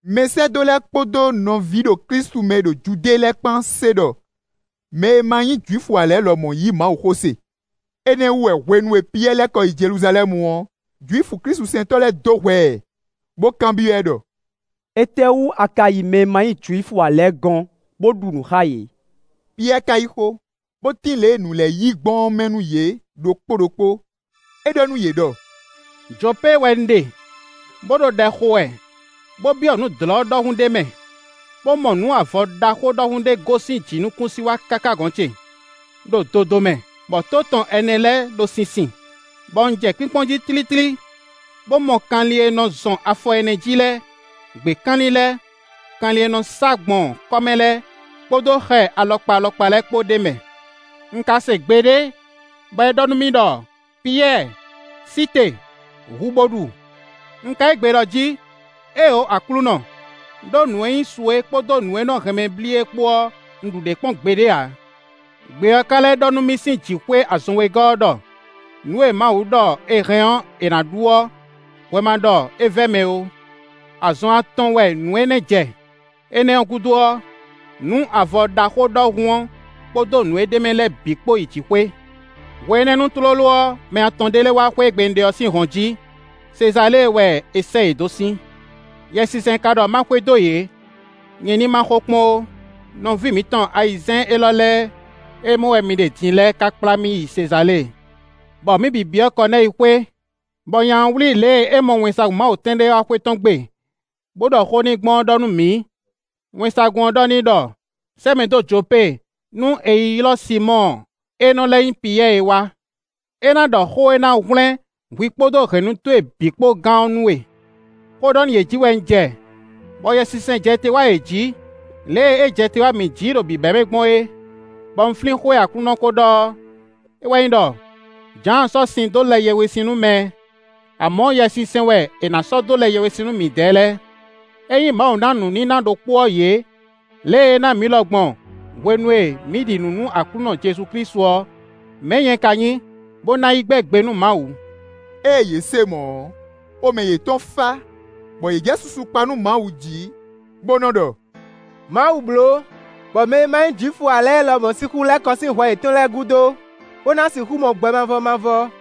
Mɛsɛ́dó lɛ́ɛ kpódó nɔví ɖo Klísu mɛ e ɖo Judée lɛ́ɛ kpán se ɖɔ mɛ e ma nyí Jwifu ǎ lɛ́ɛ lɔmɔ̌ yí Mawuxó se. Énɛ́ wú wɛ hwenu e Piyɛ́ɛ lɛ́ kɔ yi Jeluzalɛ́mu ɔ́, Jwifu klísusɛntɔ́ lɛ́ɛ dó hwɛ ɛ, bó kanbyɔ́ ɛ ɖɔ: “Étɛ́wú a ka yi mɛ e ma nyí Jwifu ǎ lɛ́ɛ gɔ́n, bó ɖu nǔ xá yě?” Piyɛ́ɛ ka yí xó, bó tín lě e nǔ lɛ́ɛ yi gbɔn ɔ́ mɛ nú yě ɖokpó ɖokpó; é ɖɔ nú yě ɖɔ: “Jopée wɛ un ɖe, bó ɖo ɖɛ xo wɛ, bó byɔ́ nǔ dlɔ̌ ɖɔhun ɖé mɛ, bó mɔ nǔ avɔ ɖaxó ɖɔhun ɖé gosín jǐnukúnsin wá káká gɔ̌n ce, ɖo dodomɛ, bɔ tó tɔn ɛnɛ lɛ́ɛ ɖo sinsin; bɔ un jɛ kpínkpɔ́n jí tlítlí, bó mɔ kanlin e nɔ zɔn afɔ ɛnɛ jí lɛ́ɛ, gběkanlin lɛ́ɛ, kanlin e nɔ sá gbɔn kɔ́ mɛ lɛ́ɛ, kpódó xɛ alɔkpa alɔkpa lɛ́ɛ kpó ɖ'é mɛ. Un ka se gbe ɖé, bɔ é ɖɔ nú mì ɖɔ: ‘Piyɛ́ɛ, sí te, hu bo ɖu.’ Un ka yí gbe ɖɔ jí: ‘Éeǒ Aklúnɔ! Đó nǔ e nyí su é kpódó nǔ e nɔ hɛn mɛ blí é kpó ɔ́, un ɖu ɖě kpɔ́n gbeɖé ǎ.’ Gbe ɔ́ ka lɛ́ ɖɔ nú mì sín jǐxwé azɔn wegɔ́ ɔ́ ɖɔ: ‘Nǔ e Mawu ɖɔ è hɛn ɔ́, è nǎ ɖu ɔ́, hwɛ ma ɖɔ é vɛ́ mɛ ó.’ Azɔn atɔn wɛ nǔ énɛ́ jɛ; énɛ́ ɔ́ gúdo ɔ́, nǔ avɔ ɖaxó ɖɔhun ɔ́ kpódó nǔ e ɖ'é mɛ lɛ́ɛ bǐ kpó yi jǐxwé. Hwenɛ́nu tlóló ɔ́, mɛ atɔn ɖé lɛ́ɛ wá xwé e gbe un ɖe ɔ́ sín hɔn jí; Sezalée wɛ è sɛ́ yě dó sín. Yɛsinsɛn ka ɖɔ ma xwedó yě; nyɛ ní má xo kpɔ́n ó. Nɔví mǐtɔn ayizɛ́n élɔ́ lɛ́ɛ e mɔ wɛ mi ɖe din lɛ́ɛ ká kplá mì yi Sezalée, bɔ mǐ bǐ byɔ́ Kɔnɛ́yi xwé, bɔ nya ɔ́ wlí lě e é mɔ wɛnsagun Mawu tɔn ɖé wá xwé tɔn gbe, bó ɖɔ xó n'i gbɔn ɔ́ ɖɔ nú mǐ; wɛnsagun ɔ́ ɖɔ n'i ɖɔ: ‘Sɛ́ mɛ dó Jopée nú è yi ylɔ́ Sinmɔ́ɔ e nɔ lɛ́ nyí Piyɛ́ɛ é wá. É ná ɖɔ xó e ná hwlɛ́n hwi kpódó hɛ̌nnu towe bǐ kpó gán ɔ́ nú we.’ Xó ɖɔ nú yě jí wɛ un jɛ, bɔ Yɛsinsɛn jɛ te wá yě jǐ, lě e é jɛ te wá mǐ jǐ ɖo bǐbɛ́mɛ gbɔn é, bɔ un flín xó e Aklúnɔ kó ɖɔ ɔ́; é wɛ nyí ɖɔ: ‘Jǎan sɔ́ sin dó lɛ yɛhwesin nú mɛ; amɔ̌ Yɛsinsɛn wɛ è nǎ sɔ́ dó lɛ yɛhwesin nú midɛɛ lɛ́ɛ.’ Ényí Mawu ná nǔníná ɖokpó ɔ́ yě, lě e é ná mǐ lɔ gbɔn hwenu e mǐ ɖi nǔ nú Aklúnɔ Jezu Klísu ɔ́, mɛ̌ nyɛ ka nyí, bó ná yi gbɛ́ gbe nú Mawu.” Ée yě se mɔ̌ ɔ́, xomɛ yětɔn fá, bɔ yě jɛ susu kpa nú Mawu jí, bó nɔ́ ɖɔ: “Mawu bló, bɔ mɛ e ma nyí Jwifu ǎ lɛ́ɛ lɔmɔ̌ sixú lɛ́ kɔ sín hwɛ yětɔn lɛ́ɛ gúdo, bó ná sixú mɔ gbɛ mavɔ mavɔ.”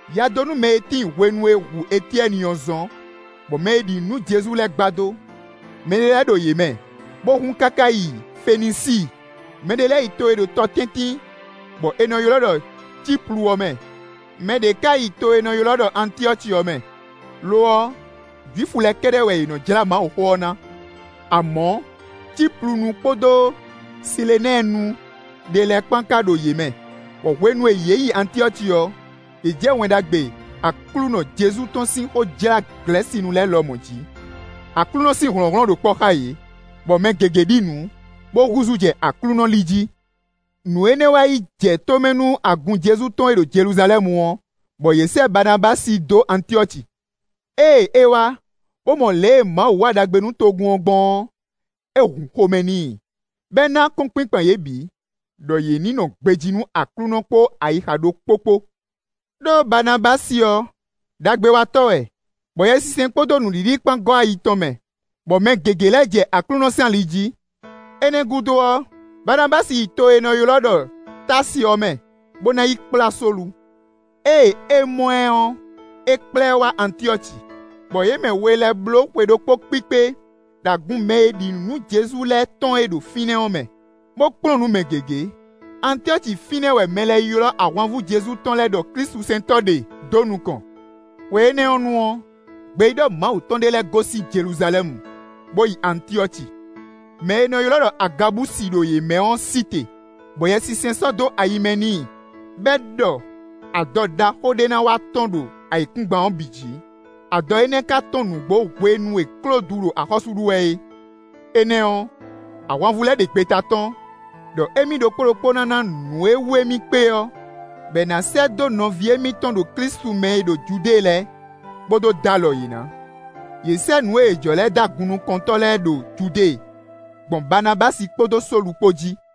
Yadónúmɛ e tíin hwenu e è hu Etyɛ́ni ɔ́ zɔ́n bɔ mɛ e ɖi nǔ nú Jezu lɛ́ɛ gbadó. Mɛ ɖé lɛ́ɛ ɖo yě mɛ, bó hun káká yi Fenisíi; mɛɖé lɛ́ɛ yi to e ɖo tɔ tɛ́ntin bɔ è nɔ ylɔ́ ɖɔ Cíplu ɔ́ mɛ; mɛ ɖě ka yi to e è nɔ ylɔ́ ɖɔ Antyɔ́ci ɔ́ mɛ; lo ɔ́, Jwifu lɛ́ɛ kɛ́ɖɛ́ wɛ yě nɔ́ jlá Mawuxó ɔ́ ná. Amɔ̌, Cíplunu kpódó Silenɛ́ɛnu ɖé lɛ́ɛ kpán ka ɖo yě mɛ, bɔ hwenu e yě yi Antyɔ́ci ɔ́, yě jɛ Wɛn Ɖagbe Aklúnɔ Jezu tɔn sín xó jlá Glɛ̌sinu lɛ́ɛ lɔmɔ̌ jí. Aklúnɔ sín hlɔ̌nhlɔ́n ɖo kpɔ́ xá yě, bɔ mɛ gěgé ɖi nǔ, bó húzú jɛ Aklúnɔ li jí. Nǔ énɛ́ wá yi jɛ tó mɛ nú agun Jezu tɔn e ɖo Jeluzalɛ́mu ɔ́, bɔ yě sɛ́ Baanabási dó Antyɔ́ci. Ée é wá, bó mɔ lě e Mawu wa ɖagbe nú togun ɔ́ gbɔn ɔ́, é hun xomɛ n'i, bɔ é ná akɔ́nkpinkpan yě bǐ, ɖɔ yě ní nɔ gbejí nú Aklúnɔ kpó ayixa ɖokpó kpó. Đó Banabási ɔ́, ɖagbewatɔ́ wɛ, bɔ Yɛsinsɛn kpódó nǔɖiɖi kpán gɔ́ ayi tɔn mɛ, bɔ mɛ gěgé lɛ́ jɛ Aklúnɔ sín ali jí. Énɛ́ gúdo ɔ́, Baanabási yi to e è nɔ ylɔ́ ɖɔ Táasi ɔ́ mɛ, bó ná yi kplá Sólu. Ée é mɔ ɛ ɔ́, é kplá ɛ wá Antyɔ́ci, bɔ yě mɛ we lɛ́ɛ bló xwe ɖokpó kpíkpé ɖo agun mɛ e ɖi nǔ nú Jezu lɛ́ɛ tɔn e ɖo fínɛ́ ɔ́ mɛ, bó kplɔ́n nǔ mɛ gěgé. Antyɔ́ci fínɛ́ wɛ mɛ lɛ́ɛ ylɔ́ ahwanvú Jezu tɔn lɛ́ɛ ɖɔ klísusɛntɔ́ ɖe dó nukɔn. Hwe énɛ́ nu ɔ́, gbeyíɖɔ Mawu tɔn ɖé lɛ́ɛ gosín Jeluzalɛ́mu, bó yi Antyɔ́ci. Mɛ e è nɔ ylɔ́ ɖɔ Agabusi ɖo yě mɛ ɔ́ sí te, bɔ Yɛsinsɛn sɔ́ dó ayi mɛ n'i bɔ é ɖɔ adɔ ɖaxó ɖé ná wá tɔ́n ɖo ayǐkúngban ɔ́ bǐ jí. (Adɔ énɛ́ ka tɔ́n nǔgbó hwenu e Klódu ɖo axɔ́sú ɖu wɛ é.) Énɛ́ ɔ́, ahwanvú lɛ́ɛ ɖe gbeta tɔ́n, ɖɔ émí ɖokpó ɖokpó ná ná nǔ e wú émí kpé ɔ́, bɔ è nǎ sɛ́ dó nɔví émítɔn ɖo Klísu mɛ e ɖo Judée lɛ́ɛ, bó dó dó alɔ yě ná. Yě sɛ́ nǔ e yě jɔ lɛ́ɛ dó agunnukɔntɔ́ lɛ́ɛ ɖo Judée, gbɔn Baanabási kpódó Sólu kpó jí.